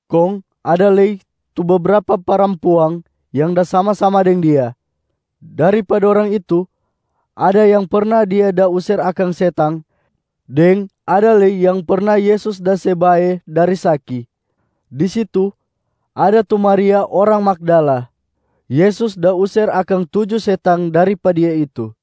Kong ada lei tu bebrapa parampuang yang da sama-sama deng Dia. Dari pa dorang itu, ada yang perna Dia da user akang setang deng ada lei yang perna Yesus da se bae dari saki. Di situ ada tu Maria orang Magdala. Yesus da user akang tuju setang dari pa dia itu.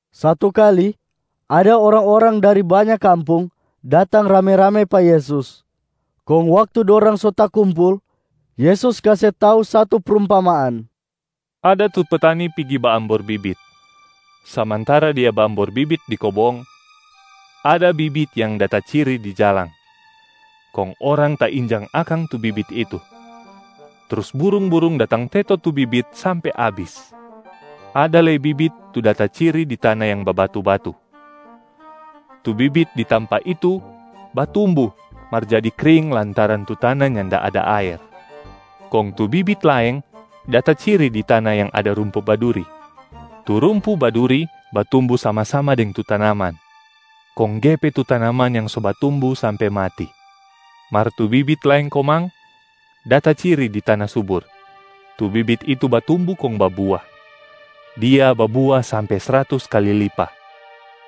Satu kali ada orang-orang dari banya kampung datang rame-rame pa Yesus. Kong waktu dorang so takumpul, Yesus kase tau satu prumpamaan, “Ada tu petani pigi baambor bibit. Samantara dia baambor bibit di kobong, ada bibit yang da taciri di jalang, kong orang tainjang akang tu bibit itu, trus burung-burung datang teto tu bibit sampe abis. Ada lei bibit tu da taciri di tana yang babatu-batu. Tu bibit di tampa itu batumbu mar jadi kring lantaran tu tana nyanda ada aer. Kong tu bibit laeng da taciri di tana yang ada rumpu baduri. Tu rumpu baduri batumbu sama-sama deng tu tanaman, kong gepe tu tanaman yang so batumbu sampe mati. Mar tu bibit laeng komang da taciri di tana subur, tu bibit itu batumbu kong babua. Dia babua sampe sratus kali lipa.”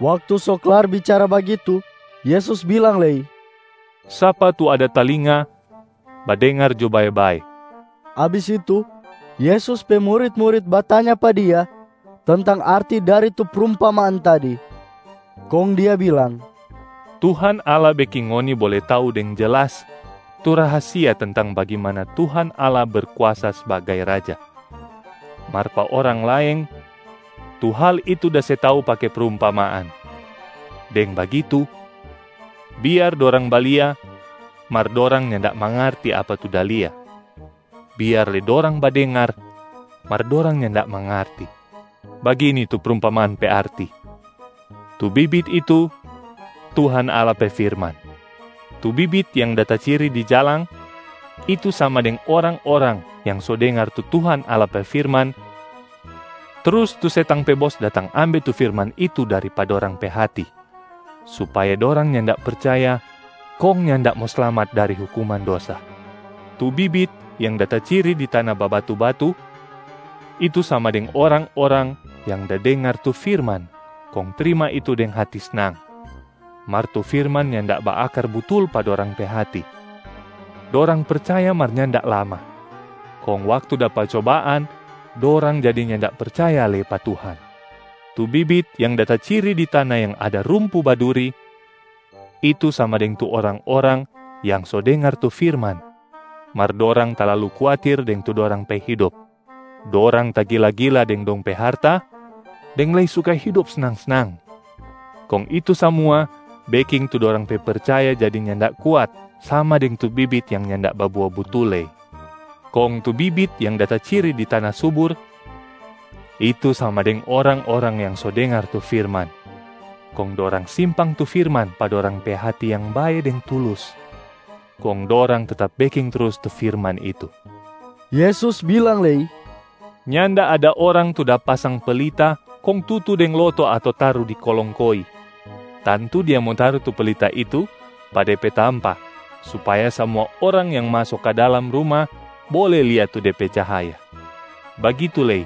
Waktu so klar bicara bagitu, Yesus bilang lei, “Sapa tu ada talinga, badengar jo bae-bae.” Abis itu Yesus pe murit-murit batanya pa Dia tentang arti dari tu prumpamaan tadi. Kong Dia bilang, “Tuhan Allah beking ngoni bole tau deng jelas tu rahasia tentang bagimana Tuhan Allah berkuasa sbagai Raja, mar pa orang laeng, tu hal itu da se tau pake prumpamaan. Deng bagitu, ‘Biar dorang balia, mar dorang nyanda mangarti apa tu da lia. Biar lei dorang badengar, mar dorang nyanda mangarti.’ Bagini tu prumpamaan pe arti: tu bibit itu, Tuhan Allah pe firman. Tu bibit yang da taciri di jalang, itu sama deng orang-orang yang so dengar tu Tuhan Allah pe firman, trus tu setang pe bos datang ambe tu firman itu dari pa dorang pe hati supaya dorang nyanda percaya kong nyanda mo slamat dari hukuman dosa. Tu bibit yang da taciri di tana babatu-batu, itu sama deng orang-orang yang da dengar tu firman kong trima itu deng hati snang. Mar tu firman nyanda baakar butul pa dorang pe hati. Dorang percaya mar nyanda lama, kong waktu dapa cobaan dorang jadi nyanda percaya lei pa Tuhan. Tu bibit yang da taciri di tana yang ada rumpu baduri, itu sama deng tu orang-orang yang so dengar tu firman mar dorang talalu kuatir deng tu dorang pe hidop, dorang tagila-gila deng dong pe harta, deng lei suka hidop snang-snang. Kong itu samua beking tu dorang pe percaya jadi nyanda kuat sama deng tu bibit yang nyanda babua butul lei. Kong tu bibit yang da taciri di tana subur, itu sama deng orang-orang yang so dengar tu firman, kong dorang simpang tu firman pa dorang pe hati yang bae deng tulus. Kong dorang tetap beking trus tu firman itu.” Yesus bilang lei, “Nyanda ada orang tu da pasang pelita kong tutu deng loto ato taru di kolong koi. Tantu dia mo taru tu pelita itu pa de pe tampa supaya samua orang yang maso ka dalam ruma bole lia tu de pe cahaya. Bagitu lei,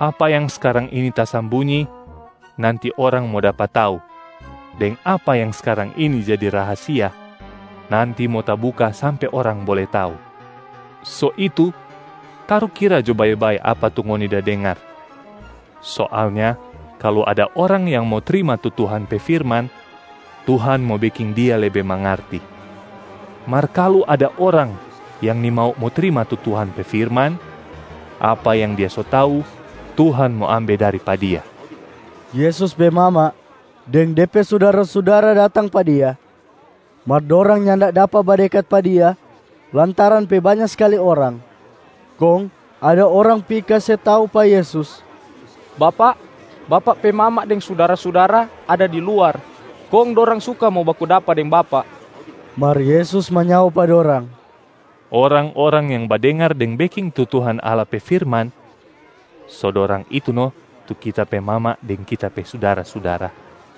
apa yang skarang ini tasambunyi, nanti orang mo dapa tau, deng apa yang skarang ini jadi rahasia, nanti mo tabuka sampe orang bole tau. So itu tarukira jo bae-bae apa tu ngoni da dengar. Soalnya kalu ada orang yang mo trima tu Tuhan pe firman, Tuhan mo beking dia lebe mangarti. Mar kalu ada orang yang nimau mo trima tu Tuhan pe firman, apa yang dia so tau Tuhan mo ambe dari pa dia.” Yesus pe mama deng De pe sudara-sudara datang pa Dia, mar dorang nyanda dapa badekat pa Dia lantaran pe banya skali orang. Kong ada orang pi kase tau pa Yesus, “Bapak, Bapak pe mama deng sudara-sudara ada di luar kong dorang suka mo baku dapa deng Bapak.” Mar Yesus manyao pa dorang, “Orang-orang yang badengar deng beking tu Tuhan Allah pe firman, so dorang itu no tu Kita pe mama deng Kita pe sudara-sudara.”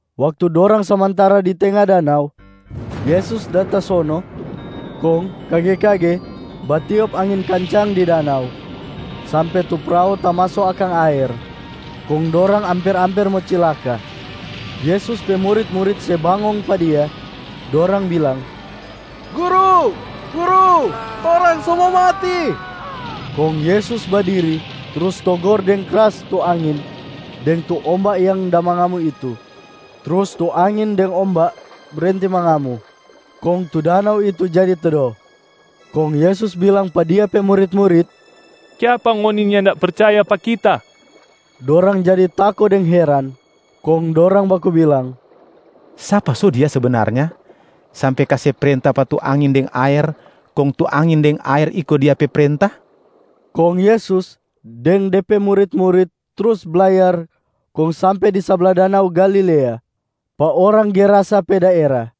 Waktu dorang samantara di tenga danau, Yesus da tasono. Kong kage-kage batiop angin kancang di danau sampe tu prao tamaso akang aer, kong dorang amper-amper mo cilaka. Yesus pe murit-murit se bangong pa Dia. Dorang bilang, “Guru, Guru, torang so mo mati!” Kong Yesus badiri trus togor deng kras tu angin deng tu omba yang da mangamu itu. Trus tu angin deng omba brenti mangamu, kong tu danau itu jadi tedo. Kong Yesus bilang pa Dia pe murit-murit, “Kiapa ngoni nyanda percaya pa Kita?” Dorang jadi tako deng heran, kong dorang baku bilang, “Sapa so Dia sebenarnya sampe kase prenta pa tu angin deng aer, kong tu angin deng aer iko Dia pe prenta?” Kong Yesus deng De pe murit-murit trus blayar kong sampe di sabla danau Galilea, pa orang Gerasa pe daera.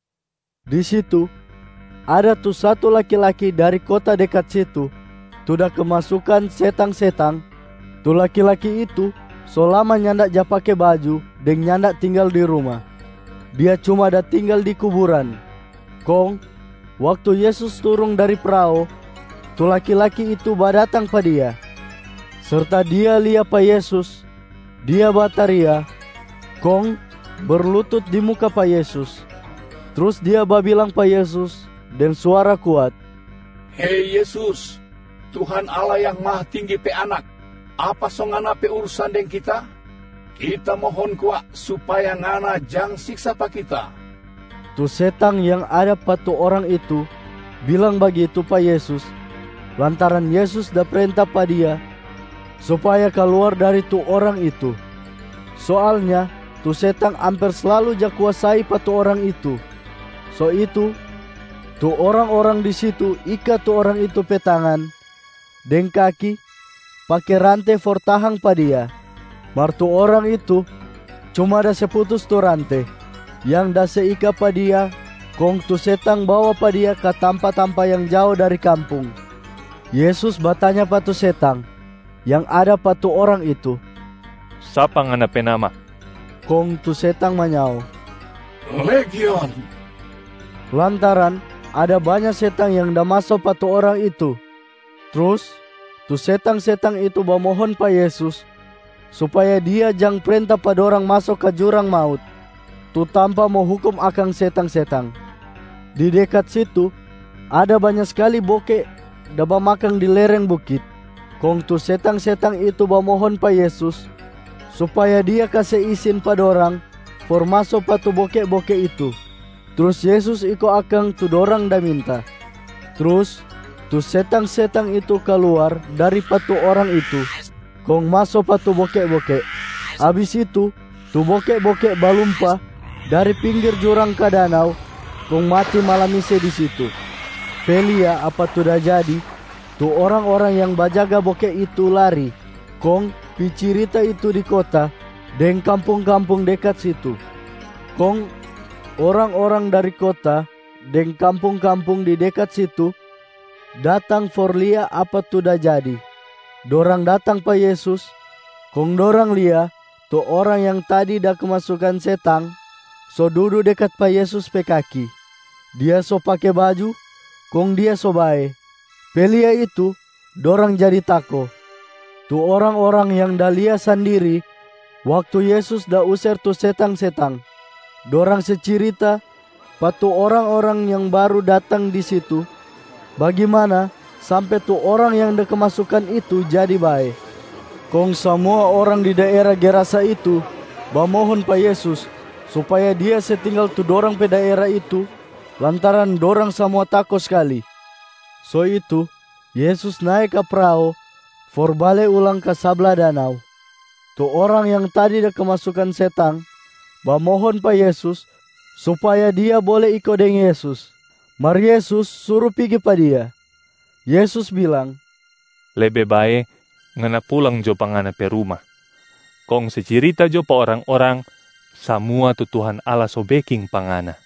Di situ, ada tu satu laki-laki dari kota dekat situ, tu da kemasukan setang-setang. Tu laki-laki itu so lama nyanda ja pake baju deng nyanda tinggal di ruma, dia cuma da tinggal di kuburan. Kong waktu Yesus turung dari prao, tu laki-laki itu badatang pa Dia. Serta dia lia pa Yesus, dia bataria kong berlutut di muka pa Yesus. Trus dia babilang pa Yesus deng suara kuat, “Hei Yesus, Tuhan Allah Yang Mahatinggi pe Anak! Apa so Ngana pe urusan deng kita? Kita mohon kwa supaya Ngana jang siksa pa kita.” Tu setang yang ada pa tu orang itu bilang bagitu pa Yesus lantaran Yesus da prenta pa dia supaya kaluar dari tu orang itu. Soalnya tu setang amper slalu ja kuasai pa tu orang itu, so itu tu orang-orang di situ ika tu orang itu pe tangan deng kaki pake rante for tahang pa dia. Mar tu orang itu cuma da se putus tu rante yang da se ika pa dia kong tu setang bawa pa dia ka tampa-tampa yang jao dari kampung. Yesus batanya pa tu setang yang ada pa tu orang itu, “Sapa ngana pe nama?” Kong tu setang manyao, “Legion,” lantaran ada banya setang yang da maso pa tu orang itu. Trus tu setang-setang itu bamohon pa Yesus supaya Dia jang prenta pa dorang maso ka jurang maut, tu tampa mo hukum akang setang-setang. Di dekat situ, ada banya skali boke da bamakang di lereng bukit. Kong tu setang-setang itu bamohon pa Yesus supaya Dia kase isin pa dorang for maso pa tu boke-boke itu. Trus Yesus iko akang tu dorang da minta. Trus tu setang-setang itu kaluar dari pa tu orang itu, kong maso pa tu boke-boke. Abis itu tu boke-boke balumpa dari pinggir jurang ka danau kong mati malamise di situ. Pe lia apa tu da jadi, tu orang-orang yang bajaga boke itu lari kong pi cirita itu di kota deng kampung-kampung dekat situ. Kong orang-orang dari kota deng kampung-kampung di dekat situ datang for lia apa tu da jadi. Dorang datang pa Yesus kong dorang lia tu orang yang tadi da kemasukan setang so dudu dekat pa Yesus pe kaki, dia so pake baju kong dia so bae. Pe lia itu, dorang jadi tako. Tu orang-orang yang da lia sandiri waktu Yesus da user tu setang-setang, dorang se cirita pa tu orang-orang yang baru datang di situ bagimana sampe tu orang yang da kemasukan itu jadi bae. Kong samua orang di daera Gerasa itu bamohon pa Yesus supaya Dia se tinggal tu dorang pe daera itu lantaran dorang samua tako skali. So itu Yesus nae ka prao for bale ulang ka sabla danau. Tu orang yang tadi da kemasukan setang bamohon pa Yesus supaya dia bole iko deng Yesus. Mar Yesus suru pigi pa dia, Yesus bilang, “Lebe bae ngana pulang jo pa ngana pe ruma, kong se cirita jo pa orang-orang samua tu Tuhan Allah so beking pa ngana.”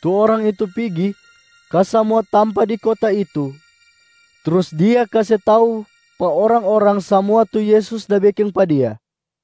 Tu orang itu pigi ka samua tampa di kota itu trus dia kase tau pa orang-orang samua tu Yesus da beking pa dia.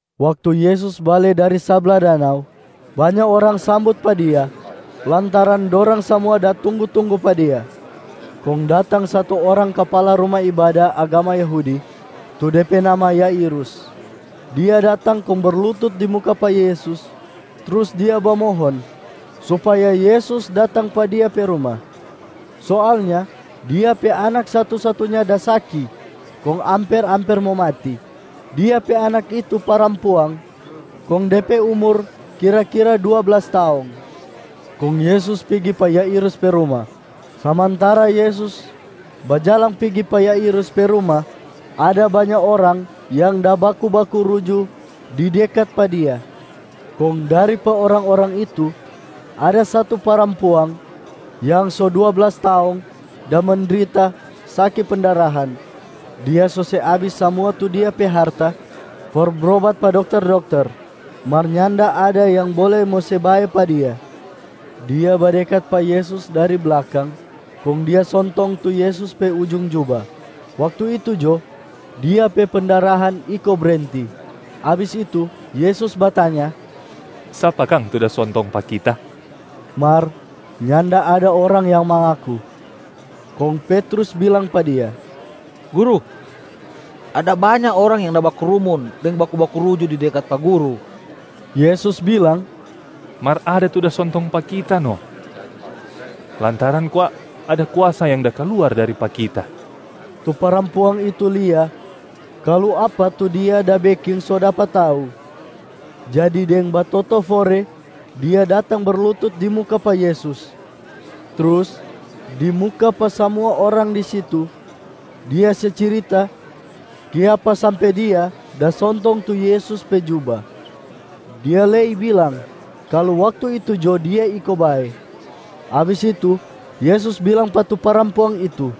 Waktu Yesus bale dari sabla danau, banya orang sambut pa Dia lantaran dorang samua da tunggu-tunggu pa Dia. Kong datang satu orang kapala ruma ibada agama Yahudi, tu de pe nama Yairus. Dia datang kong berlutut di muka pa Yesus trus dia bamohon supaya Yesus datang pa dia pe ruma. Soalnya dia pe anak satu-satunya da saki kong amper-amper mo mati. Dia pe anak itu parampuang, kong de pe umur kira-kira dua blas taong. Kong Yesus pigi pa Yairus pe ruma. Samantara Yesus bajalang pigi pa Yairus pe ruma, ada banya orang yang da baku-baku ruju di dekat pa Dia. Kong dari pa orang-orang itu, ada satu parampuang yang so dua blas taong da mendrita saki pendarahan, [Dia so se abis samua tu dia pe harta for brobat pa dokter-dokter], mar nyanda ada yang bole mo se bae pa dia. Dia badekat pa Yesus dari blakang kong dia sontong tu Yesus pe ujung juba, waktu itu jo dia pe pendarahan iko brenti. Abis itu, Yesus batanya, “Sapa kang tu da sontong pa Kita?” Mar nyanda ada orang yang mangaku. Kong Petrus bilang pa Dia, “Guru, ada banya orang yang da bakrumun deng da baku-baku ruju di dekat pa Guru.” Yesus bilang, “Mar ada tu da sontong pa Kita no, lantaran kwa ada kuasa yang da kaluar dari pa Kita.” Tu parampuang itu lia kalu apa tu dia da beking so dapa tau, jadi deng batotofore dia datang berlutut di muka pa Yesus. Trus di muka pa samua orang di situ, dia se cirita kiapa sampe dia da sontong tu Yesus pe juba. Dia lei bilang kalu waktu itu jo dia iko bae. Abis itu Yesus bilang pa tu parampuang itu,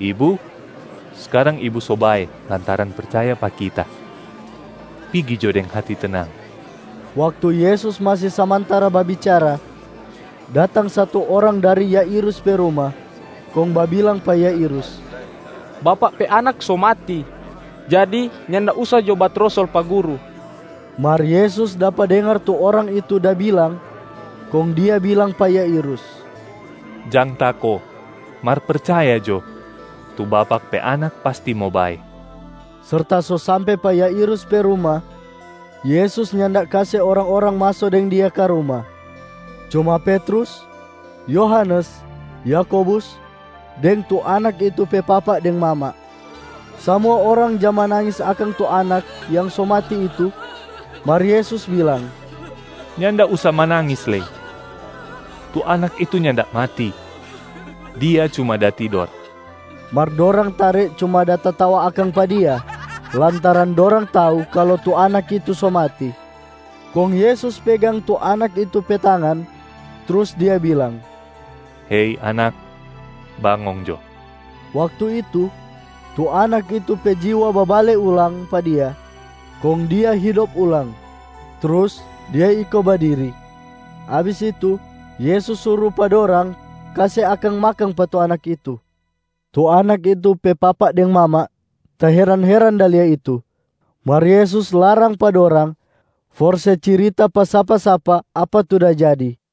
“Ibu, skarang ibu so bae lantaran percaya pa Kita. Pigi jo deng hati tenang.” Waktu Yesus masi samantara babicara, datang satu orang dari Yairus pe ruma, kong babilang pa Yairus, “Bapak pe anak so mati. Jadi nyanda usa jo batrosol pa Guru!” Mar Yesus dapa dengar tu orang itu da bilang, kong Dia bilang pa Yairus, “Jang tako, mar percaya jo! Tu bapak pe anak pasti mo bae.” Serta so sampe pa Yairus pe ruma, Yesus nyanda kase orang-orang maso deng Dia ka ruma, cuma Petrus, Yohanes, Yakobus, deng tu anak itu pe papa deng mama. Samua orang ja manangis akang tu anak yang so mati itu. Mar Yesus bilang, “Nyanda usa manangis lei! Tu anak itu nyanda mati, dia cuma da tidor.” Mar dorang tare cuma da tatawa akang pa Dia lantaran dorang tau kalu tu anak itu so mati. Kong Yesus pegang tu anak itu pe tangan, trus Dia bilang, “Hei anak, bangong jo!” Waktu itu, tu anak itu pe jiwa babale ulang pa dia kong dia hidop ulang, trus dia iko badiri. Abis itu Yesus suru pa dorang kase akang makang pa tu anak itu. Tu anak itu pe papa deng mama taheran-heran da lia itu. Mar Yesus larang pa dorang for se cirita pa sapa-sapa apa tu da jadi.